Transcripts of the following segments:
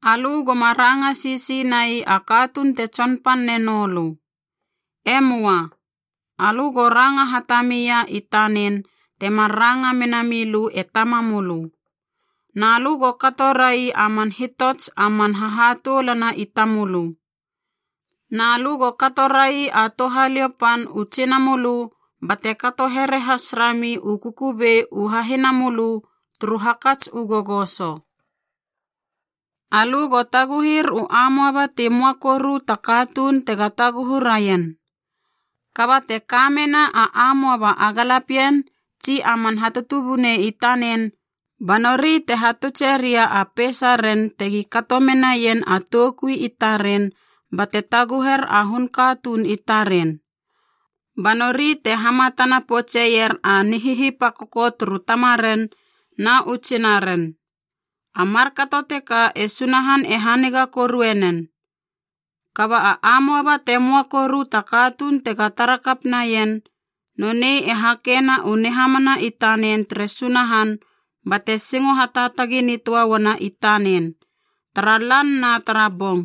Alö goma ranga sisi nai a katuun te tsonpan nenou lö. E möa. Alö go ranga hatami ia i tanen temar ranga mena milö e tamamölö. Na lö go kato rai a man hitots a man hahatoulana i tamölö. Na lö go kato rai a touhaliou pan u tsinamölö bate kato here has rami u kukubei u hahinamölö turu hakats u gogoso. Alö go taguhir u amoaba ti möa koru ta katuun tega taguhu raien. Kaba te ka mena a amoaba a galapien tsi a man hatutubunei i tanen, ba nori te hatutseria a peisaren tegi kato menaien a toukui i taren bate taguher a hun katuun i taren, ba nori te hamatana poutseier a nihihipakoko turu tamaren na u tsinaren. A markato teka e Sunahan e haniga korue nen. Kaba a amoaba te möa koru ta katuun tega tara kap naien, nonei e hakena u nihamana i tanen tere Sunahan bate singo hataatagi nitöa uana i tanen tara lan na tara bong.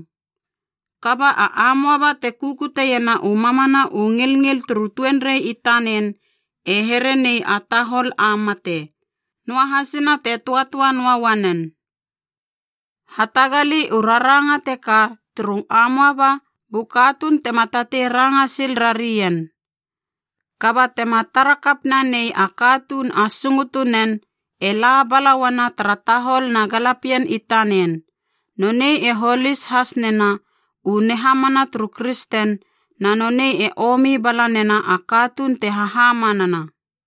Kaba a amoaba te kukutiena u mamana u ngilngil turu tuenrei i tanen e here nei a tahol a mate, noahasina te töatöa noa uanen. Hatagali u raranga teka turu amoaba bu katuun tema tatei ranga sil rarien. Kaba tema tara kap nanei a katuun a sungutunen, e la bala uana tara tahol na galapien i tanen, nonei e holis has nena u nihamana turu kristen na nonei e omi bala nena a katuun te hahamanana.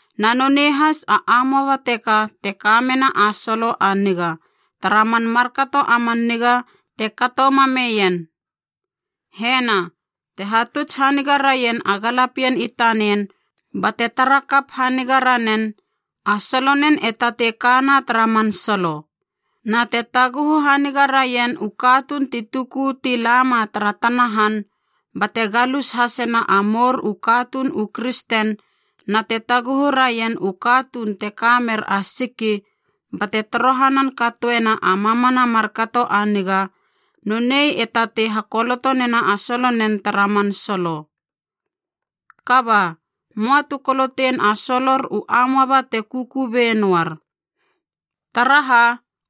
Na nonei has a amoaba teka te kamena a solo a niga tara man markato a man niga te kato mameien. Hena, te hatuts haniga raien a galapien i tanen bate tara kap haniga ranen, a solonen e tatei kana tara man solo. Na te taguhu haniga raien u katuun ti tuku ti lama tara tana han, bate galus hasena a mour u katuun u kristen na te taguhu raien u katuun te ka mer a siki bate torohanan katoena a mamana markato a niga, nonei e tatei hakoloto nena a solonen tara man solo. Kaba, möa tu kolotein a solor u amoaba te kukubei noar. Taraha,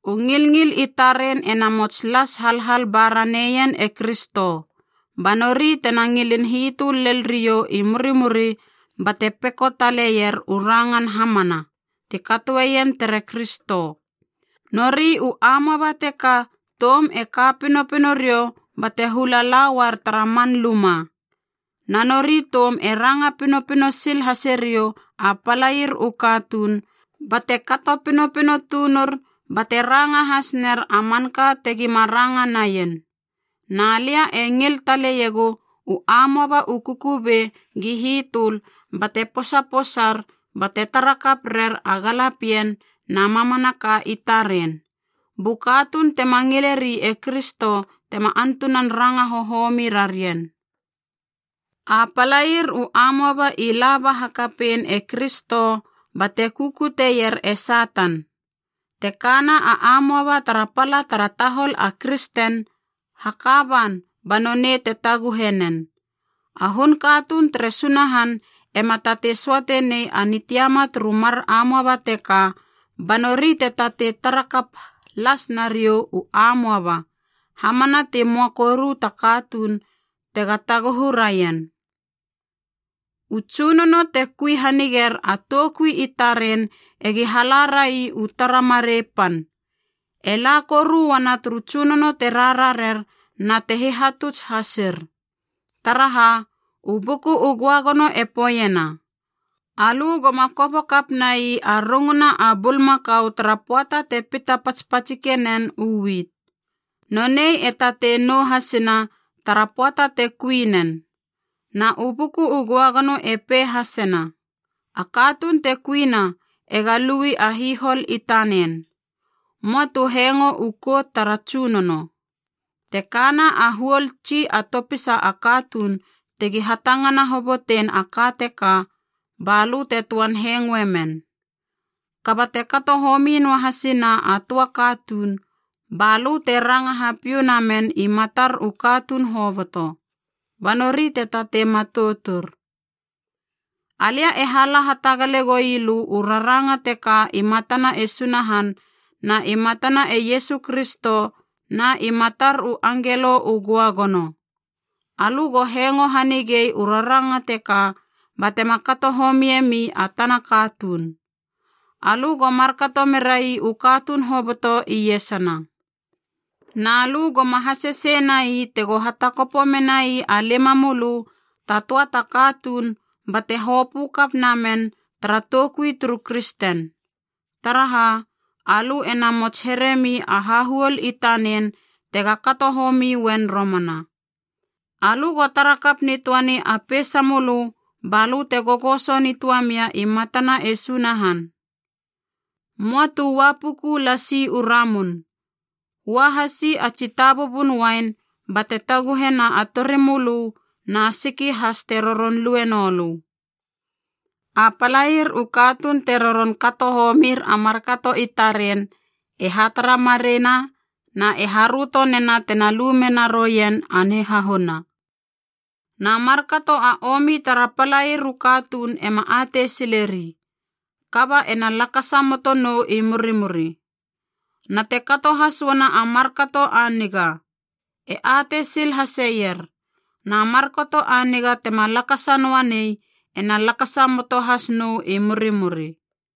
u ngilngil i taren ena mots las halhal ba raneien e Kristo, ba nori tena ngilin hitöl lel riou i murimuri bate peko taleier u rangan hamanaa ti katoeien tere Kristo. Nori u amoaba teka toum e ka pinopino riou bate hula la uar tara man luma. Na nori toum e ranga pinopino sil hase riou a palair u katuun bate kato pinopino tunur bate ranga has ner a manka tegi ma ranga naien. Na lia e ngil taleiegu u amoaba u kukubei gi hitöl bate posaposar bate tara kap rer a galapien na mamanaka i taren, bu katuun tema ngileri e Kristo tema antunan ranga hohomi rarien. A palair u amoaba i laba hakapein e Kristo bate kukutier e Satan. Te kana a amoaba tara pala tara tahol a kristen, haka ban ba nonei te taguhe nen. A hun katuun tere Sunahan ema tatei söate nei a nitiama turu mar amoaba teka ba nori te tatei tara kap las nariou u amoaba hamana ti möa koru ta katuun tega taguhu raien. U tsunono te kui haniger a toukui i taren egi hala rai u tara marei pan, e la koru uana turu tsunono te rararer na te hihatuts hasir. Taraha, u Buku u Göagono e poeiena, “Alö goma kopo kap nai a runguna a bulmakau tara pöata te pita patspatsike nen u wit. Nonei e tatei nou hasina tara pöata te kui nen.” Na u Buku u Göagono e pei hasena, “A katuun te kuina ega lui a hihol i tanen.” Möa tu hengo u kout tara tsunono. Te kana a huol tsi a topisa a katuun tegi hatangana hobotein a ka teka ba lö te töan hengoe men. Kaba te kato homi noahasina a töa katuun, ba lö te ranga hapiou namen i matar u katuun hoboto, ba nori te tatei matoutur. Alia e hala hatagale goi lö u raranga teka i matana e Sunahan na i matana e Iesu Kristo na i matar u angelo u göagono. Alö go hengo hanigei u raranga teka batema kato homie mi a tana katuun. Alö go markato merai u katuun hoboto iesana. Na lö goma hasese nai tego hatakopo menai a limamölö ta töa ta katuun bate hopö kap namen tara toukui turu kristen. Taraha, alö e namots heremi a hahuol i tanen tega kato homi uen romana. Alö go tara kap nitöani a peisamölö balö te gogoso nitöamia i matana e Sunahan. Möa tu ua puku lasi u ramun, ua hasi a tsi tabubun uain bate taguhena a torimölö na siki has te roron lue noulö. A palair u katuun te roron kato homir a markato i taren e hatara mareiena na e haröto nena tena lu mena roien a nihahuna. Na markato a omi tara palair u katuun ema atei sileri, kaba ena lakasa moto nou i murimuri. Na te kato has uana a markato a niga, e atei sil haseier, na markato a niga tema lakasa noa nei ena lakasa moto has nou i murimuri.